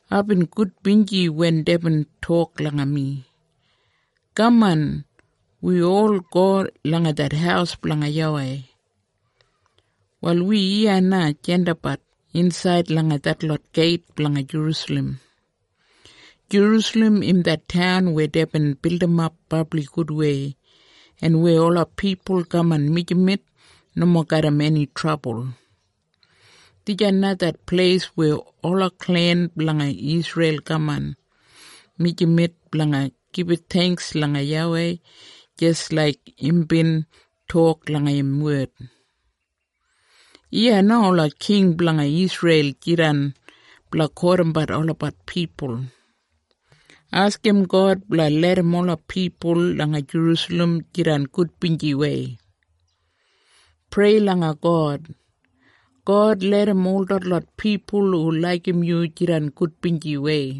Aibin gudbinji wen deibin tok langa mi, “Kaman! Wi ol go langa det haus blanga YAWEI.” Wal wi iya na jandapbat insaid langa detlot geit blanga Jerusalem. Jerusalem im det taun weya deibin bildimap brabli gudwei, en weya ola pipul kaman mijamet nomo garram eni trabul. Dijan na det pleis weya ola klen blanga Isreil kaman mijamet blanga gibit theingks langa YAWEI jis laik imbin tok langa im wed. Iya na ola king blanga Isreil jidan blanga kotimbat olabat pipul. Askim God blanga larram ola pipul langa Jerusalem jidan gudbinjiwei. Prei langa God, “God, larram ol detlot pipul hu laigim yu jidan gudbinjiwei.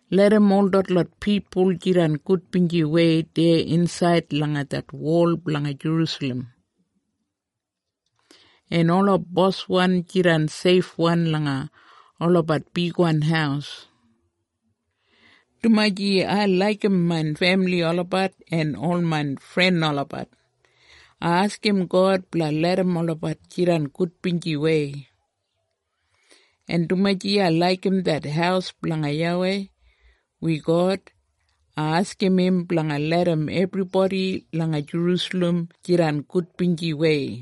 Larram ol detlot pipul jidan gudbinjiwei deya insaid langa det wol blanga Jerusalem, en ola boswan jidan seifwan langa olabat bigwan haus.” Dumaji ai laigim main femili olabat en ol main fren olabat, ai askim God blanga larram olabat jidan gudbinjiwei. En dumaji ai laigim det haus blanga YAWEI, wi God, ai askim im blanga larram ebribodi langa Jerusalem jidan gudbinjiwei.